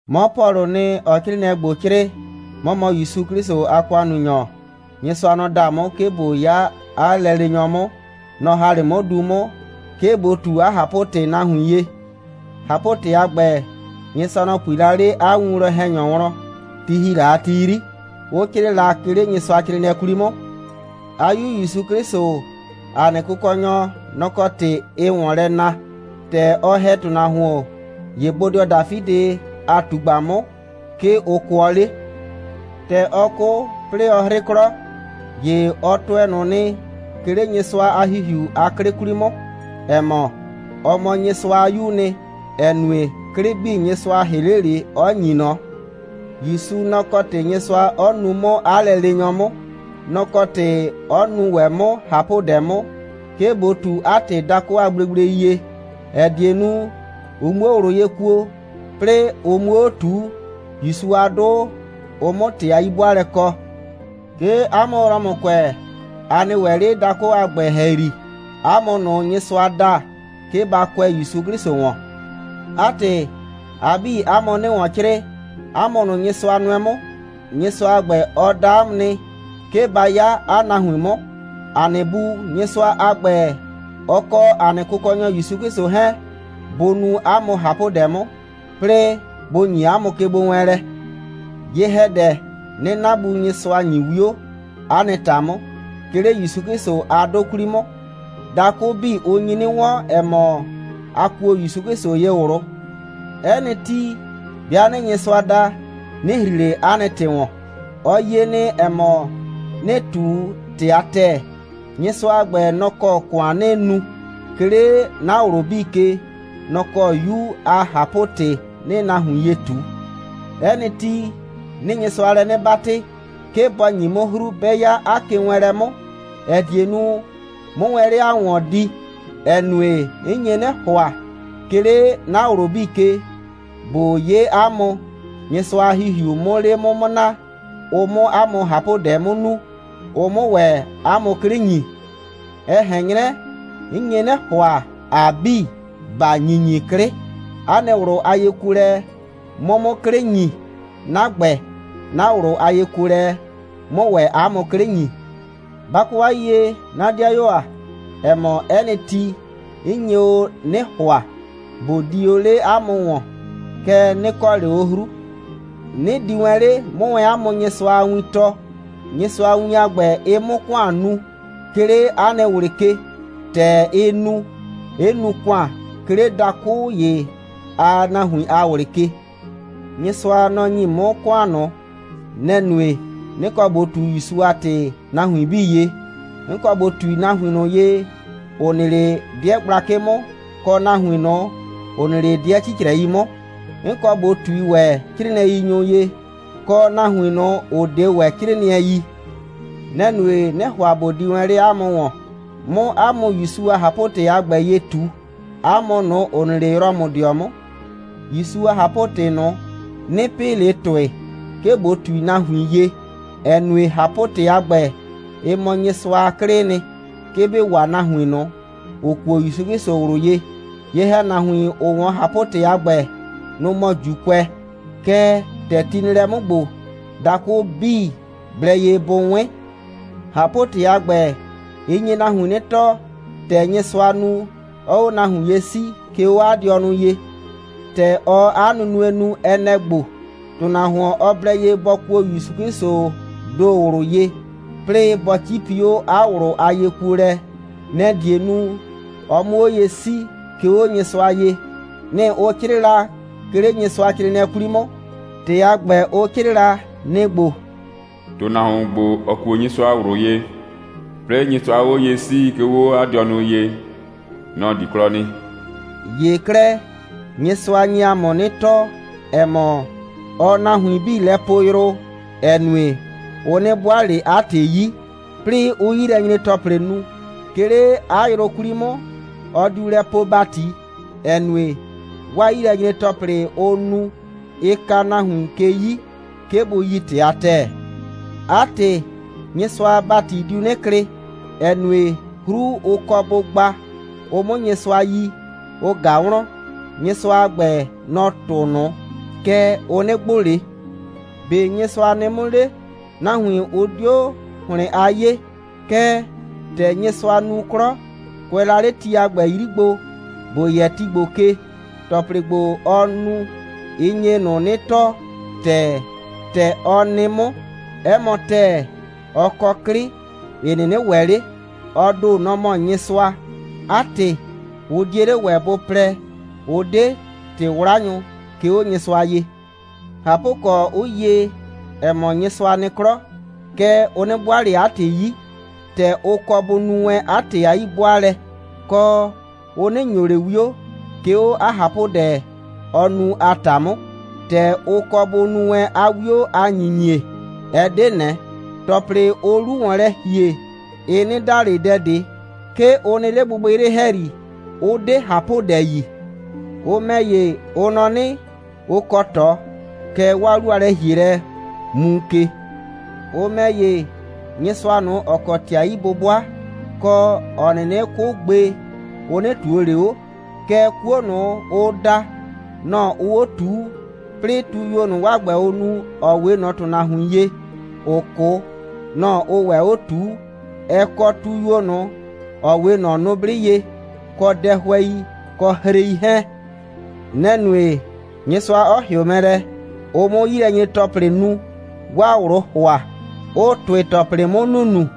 'Mɔ Pɔlʋʋ nɩ, ‑ɔɔ 'crɩɩnɩɛ ‑gbo 'crɩɩ. 'Mɔ mɔ ‑Yusu 'Klɩsʋ a ‑kʋannunyɔ. Nyɩsʋa, nɔ‑ da 'mʋ, 'ke ꞊bo 'ya 'a lɛleenyɔ 'mʋ, nɔ‑ ‑ha 'le 'mʋ du 'mʋ, 'ke ꞊bo ꞊tu 'a ꞊hapʋ‑tɩ nahuin ye. ꞊Hapʋ‑tɩ a ‑gbɛ, Nyɩsʋa, nɔ‑ pui la 'le 'a winwlɔn‑hɛnyʋ wlɔn, ti ‑hi la a ti 'yri, 'ʋ 'crɩɩ la, 'ke 'le Nyɩsʋacrɩɩnɩɛ 'kwli 'mʋ. 'A 'Yu ‑Yusu 'Klɩsʋ, ‑a nɩ Kʋkɔnyɔ, nɔ‑ kɔ ‑tɩ ɩɩ ‑wɔn lɛ na. ‑Tɛ ɔ ‑hɛ ‑tʋnahuon, ‑ye bodɩɔ Dafidɩ a ꞊tugba 'mʋ, 'ke ʋ kʋɔ 'le. ‑Tɛ ɔ 'kʋ, 'plɩɩ ɔ 'hrɩ 'klɔ, ‑ye ɔ tʋɛ ꞊nʋ nɩ, 'ke 'le Nyɩsʋa a ‑Hihiu a 'klɩ 'kwli 'mʋ, ‑ɛ mɔ, ɔ mɔ Nyɩsʋa a 'Yuu nɩ, ‑ɛ nue, 'klɩ 'bii, Nyɩsʋa ‑hɩ 'le ꞊le, 'ɔ ‑nyi ꞊nɔ. ‑Yusu, nɔ‑ kɔ ‑tɩ Nyɩsʋa 'ɔ nu 'mʋ 'a lɛleenyɔ 'mʋ. Nɔ‑ kɔ ‑tɩ 'ɔ nu ‑wɛ 'mʋ ꞊hapʋdɛ 'mʋ, 'ke ꞊bo ꞊tu 'a ‑tɩ dakʋ a gblegblei ye, ‑ɛ die nu, ʋ 'muo ꞊wlʋ ye kuo, 'plɩɩ, ʋ 'muo 'o ꞊tuu, ‑Yusu a 'dʋ, ʋ 'mʋ ‑tɩ a 'yi'bʋaalɛ kɔ. 'Ke 'a mʋ Rɔmʋkʋɛ, a nɩ ‑wɛ 'le dakʋ a ‑gbɛ ‑hɛyri. 'A mʋ ꞊nʋ Nyɩsʋa da, 'ke ba kʋɛ ‑Yusu 'Klɩsʋ ‑wɔn. 'A ‑tɩ, a 'bii, 'a mʋ 'nɩɩ ‑wɔn 'crɩɩ, 'a mʋ ꞊nʋ, Nyɩsʋa nʋɛ 'mʋ. Nyɩsʋa a ‑gbɛ, ɔ da 'a mʋ nɩ, 'ke ba 'ya 'a nahuin 'mʋ. ‑A nɩ Bu Nyɩsʋa a ‑gbɛ, ɔ kɔ ‑a nɩ Kʋkɔnyɔ ‑Yusu 'Klɩsʋ 'hɛɛn, bʋ nu 'a mʋ ꞊hapʋdɛ 'mʋ, 'plɩɩ bʋ ‑nyi 'a mʋ kegbowɛɛnlɛ. Ye‑hɛdɛ, 'nɩɩ 'na Bu Nyɩsʋa ‑nyi 'wio 'a nɩ ‑ta 'mʋ, 'ke 'le ‑Yusu 'Klɩsʋ a 'dʋ 'kwli 'mʋ. Dakʋ 'bii, ʋ nyi 'nɩ 'wɔn, ‑ɛ mɔ, a kuo ‑Yusu 'Klɩsʋ ye ꞊wlʋ. 'Ɛ nɩ ti, 'bɩa 'nɩɩ Nyɩsʋa da, 'nɩ ‑hri ꞊le 'a nɩ ‑tɩ ‑wɔn. Ɔ yie nɩ, ‑ɛ mɔ, 'nɩɩ ꞊tu ‑tɩ a ‑tɛɛ. Nyɩsʋa a ‑gbɛ, nɔ‑ kɔ ‑kʋan 'nɩɩ nu, 'ke 'le 'na ꞊wlʋ 'bii ke, nɔ‑ kɔ 'Yu a ꞊hapʋ‑tɩ 'nɩɩ nahuin ye ꞊tu. 'Ɛ nɩ ti, 'nɩɩ Nyɩsʋa lɛ 'nɩ 'batɩ, 'ke bɔ ‑nyi 'mʋ 'hru, 'bɛ 'ya 'a kewɛɛnlɛ 'mʋ, ‑ɛ die nu, 'mʋ wɛn 'le 'a mʋ ‑wɔn di, ‑ɛ nue, 'n nye 'nɩ ‑hʋa, 'ke 'le 'na ꞊wlʋ 'bii ke, ꞊bo 'ye 'a mʋ, Nyɩsʋa a ‑Hihiu 'mʋ 'le 'mʋ naa, ʋ 'mʋ 'a mʋ ꞊hapʋdɛ 'mʋ nu, ʋ 'mʋ ‑wɛ 'a mʋ 'klɩ ‑nyi. Ɛ ꞊hɛn 'nyrɛ, 'n nye 'nɩ ‑hʋa, ‑a 'bii, ‑ba ‑nyinyi 'klɩ, 'a nɩ ꞊wlʋ a yekuolɛ 'mʋ 'mʋ 'klɩ ‑nyi, 'na ‑gbɛ, 'na ꞊wlʋ a yekuolɛ 'mʋ ‑wɛ 'a mʋ 'klɩ ‑nyi. Ba kɔ 'a yiyie, 'na 'dɩayuo ‑a, ‑ɛ mɔ, 'ɛ nɩ ti, 'n nye o 'nɩ ‑hʋa, ꞊bo di o 'le 'a mʋ ‑wɔn. Kɛɛ, 'nɩ kɔ ꞊le o 'hru. 'Nɩ di wɛn 'le, 'mʋ 'a mʋ Nyɩsʋa a win tɔɔ, Nyɩsʋa a win a ‑gbɛ, ɩ 'mʋ ‑kʋan nu, 'ke 'le 'a nɩ ꞊wlɩ ke, ‑tɛ ɩ nu, 'ɩ nu ‑kʋan, 'ke 'le dakʋ ‑ye a nahuin a ꞊wlɩ ke. Nyɩsʋa, nɔ‑ ‑nyi 'mʋ ‑kʋan ꞊nʋ. Nɛ‑ nue, 'nɩ kɔ ꞊bo ꞊tu ‑Yusu a ‑tɩ nahuin 'bii ye. 'N kɔ ꞊bo ꞊tui nahuin ꞊nʋ ye, ‑ʋ nɩ 'le 'dɩɛ gblakɩ 'mʋ, kɔ nahuin ꞊nʋ, ‑ʋ nɩ 'le 'dɩɛ 'cicrɛi 'mʋ. 'N kɔ ꞊bo ꞊tui ‑wɛ 'crɩɩnɩɛyinyʋ ye, kɔ nahuin ꞊nʋ, ‑ʋ 'de ‑wɛ 'crɩɩnɩɛ yi. Nɛ‑ nue, 'nɩ ‑hʋa ꞊bo di ‑wɛ 'le 'a mʋ ‑wɔn, 'mʋ 'a mʋ ‑Yusu a ꞊hapʋ‑tɩ a ‑gbɛ ye ꞊tu, 'a mʋ ꞊nʋ, ‑ʋ nɩ 'le Rɔmʋdɩɔ 'mʋ. ‑Yusu a ꞊hapʋ‑tɩ ꞊nʋ, 'nɩ pɩ ꞊le ‑tʋɩ, 'ke ꞊bo ꞊tui nahuin ye, ‑ɛ nue, ꞊hapʋ‑tɩ a ‑gbɛ, ɩ mɔ Nyɩsʋa a 'klɩɩ nɩ, 'ke bɩ waa nahuin ꞊nʋ, ‑ʋ kuo ‑Yusu 'Klɩsʋ ꞊wlʋ ye. Ye‑hɛnahuin, ‑ʋ 'wɔn ꞊hapʋ‑tɩ a ‑gbɛ, nʋ‑ mɔ ‑Juukʋɛ, kɛɛ, ‑tɛ ti nɩ lɛ 'mʋ ‑gbo, dakʋ 'bii blɛ ye bʋ 'wɩn. ꞊Hapʋ‑tɩ a ‑gbɛ, ɩ nye nahuin 'nɩ tɔɔ, ‑tɛ Nyɩsʋaa nu, 'ɔɔ 'o nahuin ye 'sii, 'ke 'o 'a dɩɔnʋ ye. ‑Tɛ ɔɔ 'a nunue nu, ɛ nɛ‑ ‑gbo: ‑Tʋnahuon, ɔ blɛ ye bɔ kuo ‑Yusu 'Klɩsʋʋ ‑do ꞊wlʋ ye, 'plɩɩ bɔ 'cipi 'o 'a ꞊wlʋ a yekuolɛ, nɛ‑ die nu, ɔ 'mʋ 'o ye 'sii, 'ke 'o Nyɩsʋa ye. Nɩ‑ ʋ 'crɩɩ la, 'ke 'le Nyɩsʋacrɩɩnɩɛ 'kwli 'mʋ. ‑Tɩ a ‑gbɛ, ʋ 'crɩɩ la, nɩ‑ ‑gbo: «‑Tʋnahuon ‑gbo, ‑ɔ kuo Nyɩsʋa ꞊wlʋ ye, 'plɩɩ Nyɩsʋaa 'o ye 'sii, 'ke 'o 'a dɩɔnʋ ye, nɔ‑ di 'klɔ nɩ.» ‑Ye 'klɛɛ, Nyɩsʋa nye ‑a mʋ 'nɩ tɔɔ, ‑ɛ mɔ, ɔɔ nahuin 'bii lɛ poo yrʋ, ‑ɛ nue, ʋ 'nɩ 'bʋaa ꞊le 'a ‑tɩ 'yi, 'plɩɩ 'ʋʋ 'yilɛnyre‑tɔplɩ nu. 'Ke 'le 'a yrʋ 'kwli 'mʋ, ɔ diu lɛ poo ‑bati, ‑ɛ nue, 'waa 'yilɛnyre‑tɔplɩ, ʋʋ nu, ɩ ka nahuin ke 'yi, 'ke bʋ yi ‑tɩ a ‑tɛɛ. 'A ‑tɩ, Nyɩsʋa a ‑bati diu 'nɩ klɩ, ‑ɛ nue, 'hru, ʋ kɔ bʋ gba, ʋ 'mʋ Nyɩsʋa yi, ʋ ꞊ga wlɔn. Nyɩsʋa a ‑gbɛ, nɔ‑ tʋʋ ꞊nʋ, kɛɛ, ʋ 'nɩ gbʋ ꞊le. ‑Be' Nyɩsʋa nɩ 'mʋ 'le? Nahuin, ʋ 'dio ‑hlɩn a 'yee. Kɛɛ, ‑tɛ Nyɩsʋa nu 'klɔ, kʋɛ la 'le ti a ‑gbɛ 'yri gbo, ‑bo yɛ ti ‑gbo ke, ‑tɔplɩ ‑gbo, ɔ nu, ɩ nye ꞊nʋ 'nɩ tɔɔ ‑tɛɛ, ‑tɛ ɔ nɩ 'mʋ. 'Ɛ mɔ ‑tɛɛ, ɔ kɔ 'klɩ, ‑ɩ 'nɩnɩ ‑wɛ 'le. Ɔ ‑do, nɔ‑ mɔ Nyɩsʋa. 'A ‑tɩ, ʋ 'die 'le ‑wɛ bʋ plɛ, ʋ 'de ‑tɩ'wlanyʋ, 'ke 'o Nyɩsʋa ye. ꞊Hapʋkɔ, 'ʋ yie, ‑ɛ mɔ, Nyɩsʋa nɩ 'klɔ, kɛɛ, ʋ 'nɩ 'bʋaa ꞊le 'a ‑tɩ 'yi, ‑tɛ ʋ kɔ bʋ nu wɛn 'a ‑tɩ a 'yi'bʋaalɛ, kɔ, ʋ 'nɩ ‑nyo ꞊le 'wio, 'ke 'o 'a ꞊hapʋdɛ, ɔɔ nu a ‑ta 'mʋ, ‑tɛ ʋ kɔ bʋ nu wɛn 'a 'wio a ‑nyinyie, ɛ 'de ꞊nɛ. ‑Tɔplɩ, ʋʋ 'lu ‑wɔn lɛ ‑hie, ɩ 'nɩ da ꞊le dɛ ꞊de. 'Ke ʋ nɩ 'le gbɩgbɩyrɩ ‑hɛyri, 'ʋ 'de ꞊hapʋdɛ yi. Ʋ ‑mɛ ‑ye, ʋ nɔ 'nɩ, ʋ kɔ ꞊tɔ, kɛɛ, 'waa 'lu a lɛ‑hielɛ muu ke. Ʋ ‑mɛ ‑ye, Nyɩsʋa ꞊nʋ, ‑ɔ kɔ ‑tɩ a 'yi'bʋbʋa, kɔ, ‑ɔ 'nɩnɩ 'kʋ gbe, ʋ 'nɩ ꞊tuo ꞊le 'o, kɛɛ, 'kuo ꞊nʋ, ʋʋ da, nɔ‑ ʋʋ 'o ꞊tuu, 'plɩɩ tuyuo ꞊nʋ, 'waa ‑gbɛ, ʋʋ nu, ‑ɔ 'we ꞊nɔ ‑tʋnahuin ye, ‑ʋʋ 'kʋ, nɔ‑ ʋʋ ‑wɛ 'o ꞊tuu, ɛ kɔ tuyuo ꞊nʋ, ‑ɔ 'we ꞊nɔ nʋblɩ ye, kɔ dɛhʋɛi, kɔ hrei 'hɛɛn. Nɛ‑ nue, Nyɩsʋa 'ɔ ‑hɩʋ mɛ lɛ, ʋ 'mʋ 'yilɛnyre‑tɔplɩ nu, 'waa ꞊wlʋʋ ‑hʋa, 'ʋʋ ‑tʋɩ‑tɔplɩ 'mʋ nunu.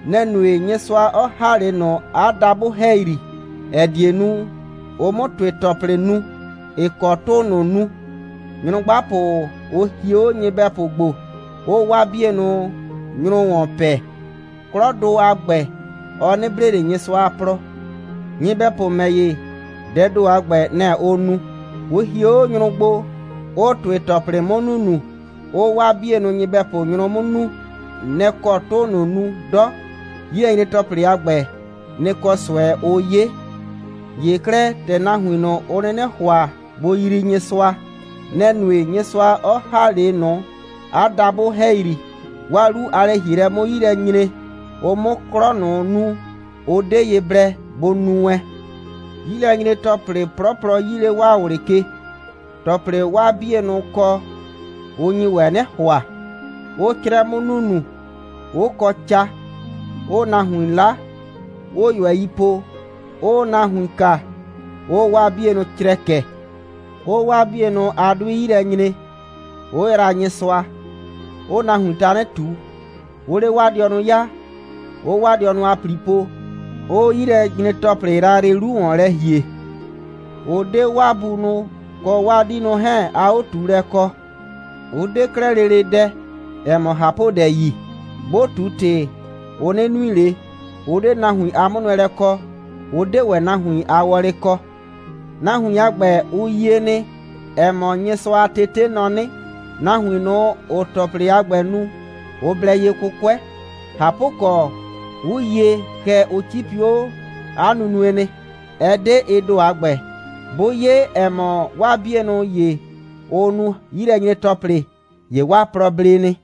Nɛ‑ nue, Nyɩsʋa 'ɔ ‑ha 'le ꞊nʋ 'a dabʋ ‑hɛyri, ‑ɛ die nu, ʋ 'mʋ ‑tʋɩ‑tɔplɩ nu, ‑ɩ kɔ 'tʋʋ ꞊nʋ nu. Nyrʋgbapʋ, ʋ hie 'o nyɩbɛpʋ gbo, 'ʋʋ 'waa 'bienʋ nyrʋ ‑wɔn pɛ. 'Klɔdʋ a ‑gbɛ, ɔ 'nɩ blee ꞊le Nyɩsʋa a plɔ. Nyɩbɛpʋ ‑mɛ ‑ye, dɛɛ ‑do a ‑gbɛ, nɛ‑ ʋʋ nu. Ʋ hie 'o nyrʋ gbo, 'ʋʋ ‑tʋɩ‑tɔplɩ 'mʋ nunu, 'ʋʋ 'waa 'bienʋ nyɩbɛpʋ nyrʋ 'mʋ nuu, nɛ‑ kɔ 'tʋʋ ꞊nʋ nu 'dɔ. 'Yilɛnyre‑tɔplɩ a ‑gbɛ, nɩ‑ kɔ ꞊sʋɛ ʋʋ 'ye. ‑Ye 'klɛɛ, ‑tɛ nahuin ꞊nʋ, ʋ 'nɩnɩ ‑hʋa bʋ yrii Nyɩsʋa, nɛ‑ nue, Nyɩsʋa 'ɔ ‑ha 'le ꞊nʋ 'a dabʋ ‑hɛyri, 'waa 'lu a lɛ‑hielɛ 'mʋ 'yi lɛ nyre, ʋ 'mʋ 'klɔ ꞊nʋ nu, ʋ 'de ye blɛ bʋ nu wɛn. 'Yilɛnyre‑tɔplɩ 'plɔplɔ 'yii 'le 'waa ꞊wlɩ ke. ‑Tɔplɩ, 'waa 'bienʋ kɔ, ʋ nyi ‑wɛ 'nɩ ‑hʋa, 'ʋʋ 'crɛ 'mʋ nunu, 'ʋ kɔ ca, 'ʋʋ nahuin 'la, 'ʋʋ ꞊yʋɛi po, 'ʋʋ nahuin kaa, 'ʋʋ 'waa 'bienʋ crɛkɛ, 'ʋʋ 'waa 'bienʋ a 'dʋɩ 'yi lɛ nyre, 'ʋ yraa Nyɩsʋa, 'ʋʋ nahuin tanɩ ꞊tu, 'ʋʋ 'le 'waa dɩɔnʋ 'yaa, 'ʋʋ 'waa dɩɔnʋ a ‑pli po, 'ʋʋ 'yilɛnyre‑tɔplɩ yrayrɩ 'lu ‑wɔn lɛ ‑hie, 'ʋ 'de 'waa bunʋ kɔ 'waa 'diinʋ 'hɛɛn a 'o꞊tuulɛ kɔ. Ʋ 'de 'klɛɛ lele dɛ, ‑ɛ mɔ ꞊hapʋdɛ yi. 'Bʋ ꞊tu ‑tɩ, ʋ 'nɩ nui ꞊le. Ʋ 'de nahuin a 'mʋnʋɛlɛ kɔ, ʋ 'de ‑wɛ nahuin a wɔlɩ kɔ. Nahuin a ‑gbɛ, ʋ yie nɩ, ‑ɛ mɔ, Nyɩsʋa a tete nɔ 'nɩ, nahuin ꞊nʋ, ‑ʋʋ ‑tɔplɩ a ‑gbɛ nu, ʋ blɛ ye 'kʋkʋɛ. ꞊Hapʋkɔ, 'ʋ yie, kɛɛ, ʋ 'cipi 'o 'a nunue nɩ. Ɛ 'de ɩ ‑do a ‑gbɛ. 'Bʋ 'ye, ‑ɛ mɔ, 'waa 'bienʋ ‑ye, ʋʋ nu 'yilɛnyre‑tɔplɩ, ‑ye 'waa plɔ ble nɩ.